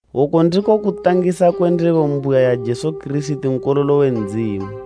Oku ndiko kutangisa kwe ndebo mbuya ya Jesu Kirisiti Nkololo we Ndzimu,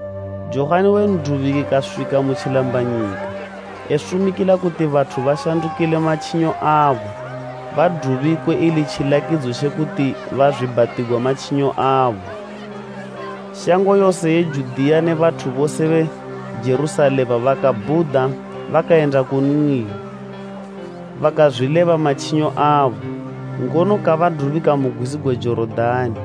Johani we N'dubiki kaswika mu tjilambanyika, esumikila kuti bathu bashandukile matjinyo abo badubikwe ili tjilakidzo tje kuti bazwiibhatigwa matjinyo abo. Shango yose ye Judiya ne bathu bose be Jerusalema bakabhuda bakayenda kunli. Bakazwileba matjinyo abo, ngono kabadubika mu gwizi gwe Jorodani.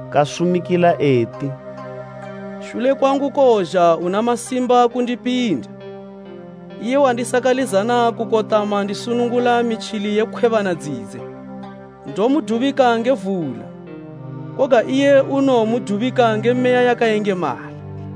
Kasumikila eti, “Shule kwangu kowozha una masimba kundipinda, iye wandisakalizana kukotama ndisunungula mitjili ye khwebana dzidze. Ndomudubika nge vula, koga iye unowomudubika nge Meya yakayengemala.”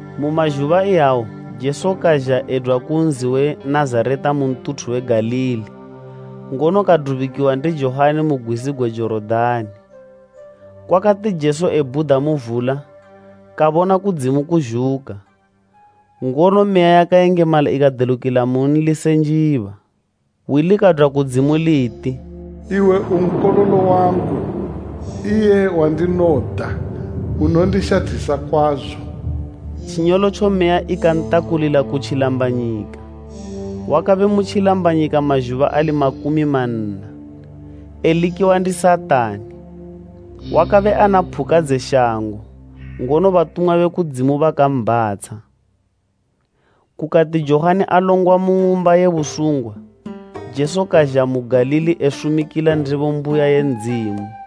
Mu mazhuba iyawo Jesu kazha edwa ku nzi we Nazareta mu ntuthu we Galili, ngono kadubikiwa ndi Johani mu gwizi gwe Jorodani. Kwakati Jesu ebhuda mu vula, kabona kudzimu kuzhuka, ngono Meya yakayengemala ikadelukila munli se njiba. Hwi likadwa kudzimu liti, “Iwe u Nkololo wangu, iye wandinoda, unondishathisa kwazo.” Tjinyolotjo Meya ikantakulila ku tjilambanyika. Wakabe mu tjilambanyika mazhuba ali makumi manna, elikiwa ndi Satani. Wakabe ana phuka dze shango, ngono batumwa be kudzimu bakambhatsha. Kukati Johani alongwa mu ng'umba ye busungwa, Jesu kazha mu Galili esumikila ndebo mbuya ye Ndzimu.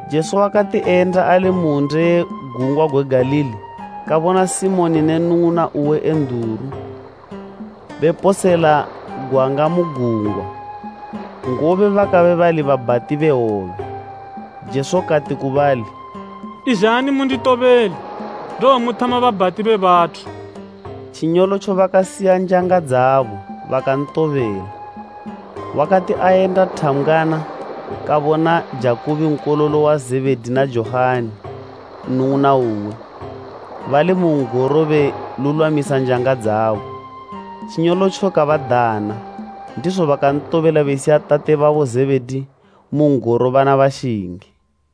Jesu wakati eyenda ali mu hwunde ye gungwa gwe Galili, kabona Simoni ne nnung'una uwe Enduru, beposela gwanga mu gungwa, ngobe bakabe bali babhati be hwobe. Jesu kati ku bali, “Izhani munditobele, ndowomuthama babhati be bathu.” Tjinyolotjo bakasiya njanga dzabo, bakantobela. Wakati ayenda thambgwana kabona Jakubo nkololo wa Zebhedi na Johani nnung'una uwe, bali mu n'goro belulwamisa njanga dzabo. Tjinyolotjo kabadana, ndizo bakantobela besiya tate babo Zebhedi mu n'goro bana bashingi.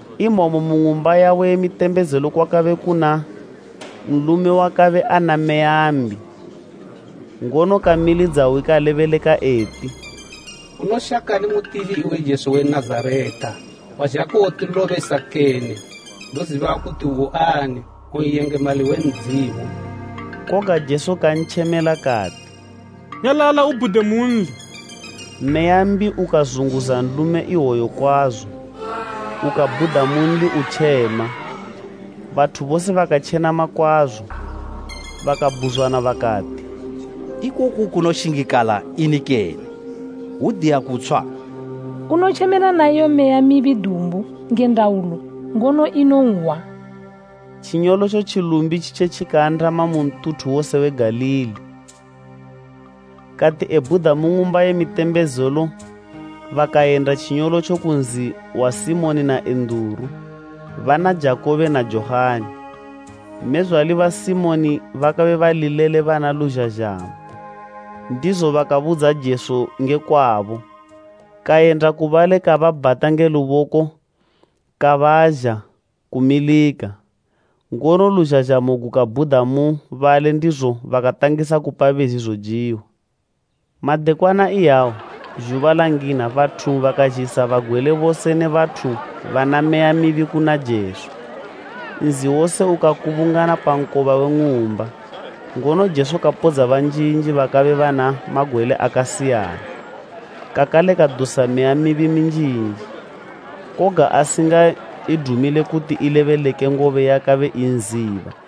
Imomo mu ng'umba yabo ye mitembezelo kwakabe kuna nlume wakabe ana meya mbi, ngono kamilidza hwi kalebeleka eti, “Unoshakani mutili iwe Jesu we Nazareta? Wazha kuwotilobesa kene? Ndoziba kuti uani, u N'yengemali we Ndzimu!” Koga Jesu kantjemela kati, “Nyalala ubhude munli!” Meya mbi ukazunguza nlume ihwoyo kwazo, ukabhuda munli utjema. Bathu bose bakatjenama kwazo, bakabhuzwana bakati, “Ikoku kunoshingikala ini kene? Hwudiya kutshwa! Unotjemela na iyo meya mibi dumbu nge ndaulo, ngono inonhwa.” Tjinyolotjo tjilumbi tjitje tjikaandama mu ntuthu wose we Galili. Kati ebhuda mu ng'umba ye mitembezelo bakayenda tjinyolotjo ku nzi wa Simoni na Enduru, bana Jakubo na Johani. Mmezwale ba Simoni bakabe bali lele bana luzhazhamo, ndizo bakabudza Jesu nge kwabo. Kayenda ku bali kababhata nge luboko kabaazha kumilika, ngono luzhazhamo gukabhuda mu bali ndizo bakatangisa kupa bezi zojiwa. Madekwana iyawo, zhuba langina bathu bakazhisa bagwele bose ne bathu bana meya mibi kuna Jesu. Nzi wose ukakubungana pa nkoba we ng'umba. Ngono Jesu kapodza banjinji bakabe bana magwele akasiyana. Kakale kadusa meya mibi minjinji, koga asingaidumile kuti ilebeleke ngobe yakabe inziba.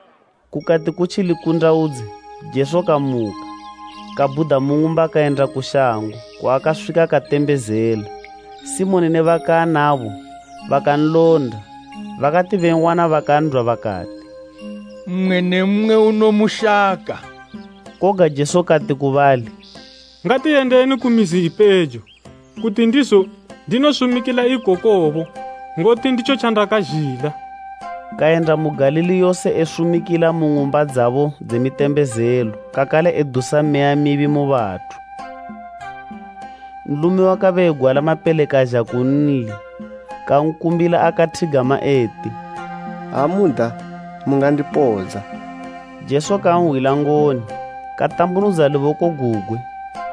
Kukati kutji likundawudze, Jesu kamuka, kabhuda mu ng'umba kayenda ku shango kwaakaswika katembezela. Simoni ne baakabe anabo bakanlonda, bakati ben'wana bakan'dwa bakati, “Mmwe ne mmwe unomushaka.” Koga Jesu kati ku bali, “Ngatiyendeni ku mizi ipejo, kuti ndizo ndinosumikila ikokobo, ngoti nditjo tjandakazhila.” Kayenda mu Galili yose esumikila mu ng'umba dzabo dze mitembezelo, kakale edusa meya mibi mu bathu. Nlume wakabe egwala mapele kazha kunli, kankumbila akathigama eti, “Ha muda, mungandipodza.” Jesu kanhwila ngoni, katambunudza luboko gugwe,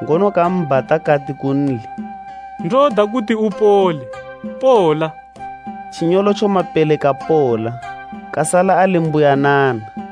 ngono kambhata kati kunli, “Ndoda kuti upole; pola.” Tjinyolotjo mapele kapola, kasala ali mbuyanana.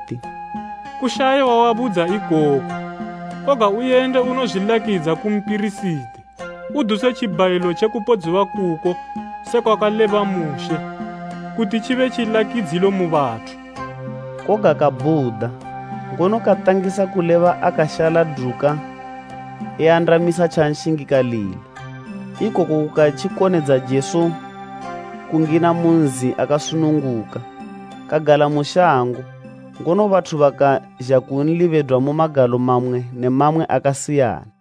eti, “Kushaye wawabudza ikoku, koga uyende unozwilakidza ku mpirisiti, uduse tjibhayilo tje kupodziwa kuko sekwakaleba Mushe, kuti tjibe tjilakidzilo mu bathu.” Koga kabhuda, ngono katangisa kuleba akashaladuka eandamisa tjanshingikalila. Ikoku kukatjikonedza Jesu kungina mu nzi akasununguka, kagala mu shango, ngono bathu bakazha kunli bedwa mu magalo mamwe ne mamwe akasiyana.